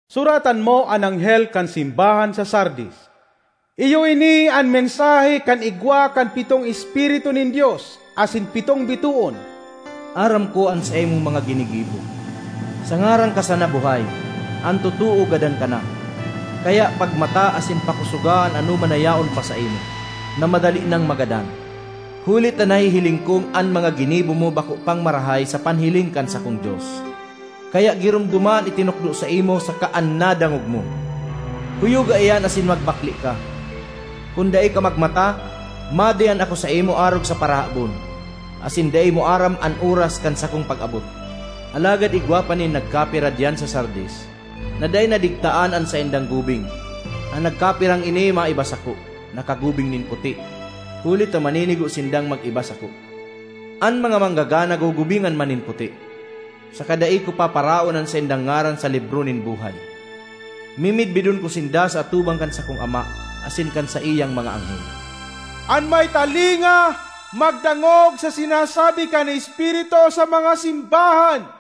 ”Suratan mo an anghel kan simbahan sa Sardis: “Iyo ini an mensahe kan igwa kan pitong espiritu nin Dios asin pitong bitoon. Aram ko an saimong mga ginigibo; sa ngaran ka sana buhay, an totoo gadan ka na. Kaya pagmata asin pakosoga an anoman na yaon pa saimo, na madali nang magadan. Huli ta nahihiling kong an mga ginibo mo bako pang marahay sa panhiling kan sakong Dios. Kaya giromdoma an itinukdo saimo saka an nadangog mo; kuyoga iyan asin magbakle ka. Kun dai ka magmata, madiyan ako saimo arog sa parahabon, asin dai mo aram an oras kan sakong pag-abot. Alagad igwa pa nin nagkapira diyan sa Sardis na dai nadigtaan an saindang gubing; an nagkapirang ini maiba sako, nakagubing nin puti, huli ta maninigo sindang mag-iba sako. An mga manggagana gugubingan man nin puti, saka dai ko paparaon an saindang ngaran sa libro nin buhay. Mimidbidon ko sinda sa atubang kan sakong Ama asin kan saiyang mga anghel. ”An may talinga, magdangog sa sinasabi kan Espiritu sa mga simbahan!”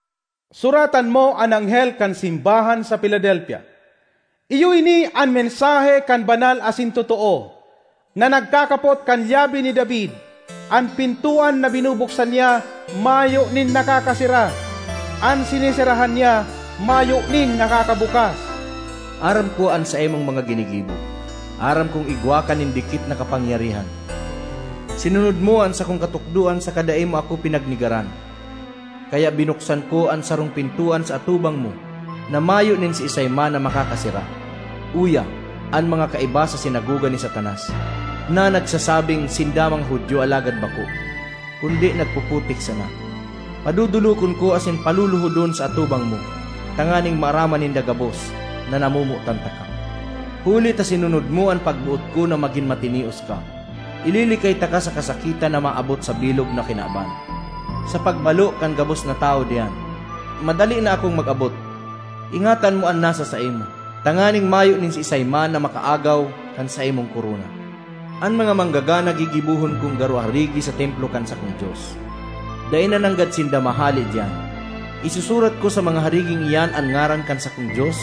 ”Suratan mo an anghel kan simbahan sa Filadelfia: “Iyo ini an mensahe kan Banal asin Totoo, na nagkakapot kan lyabe ni David; an pintoan na binubuksan niya mayo nin nakakasera; an sineserahan niya mayo nin nakakabukas. Aram ko an saimong mga ginigibo; aram kong igwa ka nin dikit na kapangyarihan. Sinunod mo an sakong katukdoan saka dai mo ako pinagnegaran. Kaya binuksan ko an sarong pintoan sa atubang mo na mayo nin siisay man na makakasera. Uya, an mga kaiba sa sinagoga ni Satanas, na nagsasabing sinda mga Judio alagad bako, kundi nagpuputik sana, padodolokon ko asin paluluhodon sa atubang mo, tanganing maaraman ninda gabos na namomotan taka. Huli ta sinunod mo an pagboot ko na magin matinios ka, ililikay taka sa kasakitan na maabot sa bilog na kinaban, sa pagbalo kan gabos na tawo diyan. Madali na akong mag-abot. Ingatan mo an nasa saimo, tanganing mayo nin siisay man na makaagaw kan saimong korona. An mga manggagana gigibohon kong garo harigi sa templo kan sakong Dios; dai na nanggad sinda mahale diyan. Isusurat ko sa mga hariging iyan an ngaran kan sakong Dios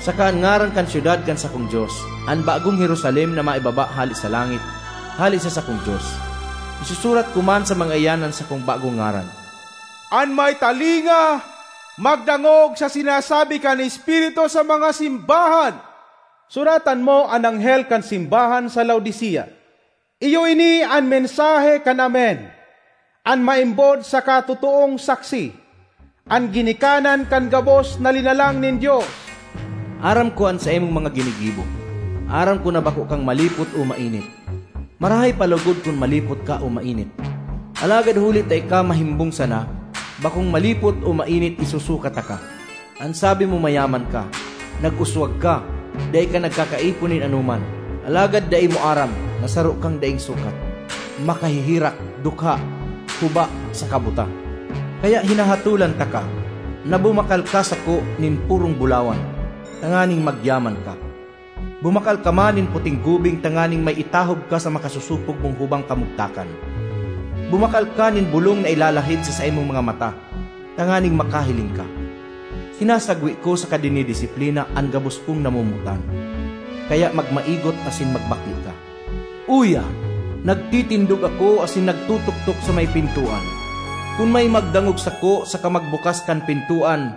saka an ngaran kan syudad kan sakong Dios, an bagong Jerusalem na maibaba hale sa langit, hale sa sakong Dios. Isusurat ko man sa mga iyan an sakong bagong ngaran. ”An may talinga, magdangog sa sinasabi kan Espiritu sa mga simbahan! ”Suratan mo an anghel kan simbahan sa Laodicea: “Iyo ini an mensahe kan Amen, an maimbod saka totoong saksi, an ginikanan kan gabos na linalang nin Dios. Aram ko an saimong mga ginigibo; aram ko na bako kang malipot o mainit. Marahay pa logod kun malipot ka o mainit! Alagad huli ta ika mahimbong sana, bakong malipot o mainit, isusuka taka! An sabi mo mayaman ka, nag-uswag ka, dai ka nagkakaipo nin anoman. Alagad dai mo aram na saro kang daing sukat, makaheherak, dukha, huba saka buta! Kaya hinahatolan taka na bumakal ka sako nin purong bulawan, tanganing magyaman ka. Bumakal ka man nin puting gubing tanganing may itahob ka sa makasosopog mong hubang kamugtakan. Bumakal ka nin bolong na ilalahid sa saimong mga mata tanganing makahiling ka. Sinasagwe ko saka dinidisiplina an gabos kong namomotan. Kaya magmaigot asin magbakle ka. Uya, nagtitindog ako asin nagtotoktok sa may pintoan. Kun may magdangog sako saka magbukas kan pintoan,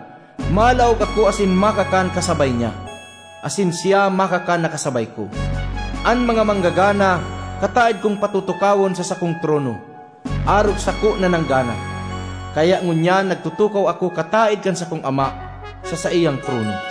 malaog ako asin makakan kasabay niya, asin siya makakan na kasabay ko. An mga manggagana kataed kong patutukawon sa sakong trono, arog sako na nanggana, kaya ngunyan nagtutukaw ako kataed kan sakong Ama sa saiyang trono.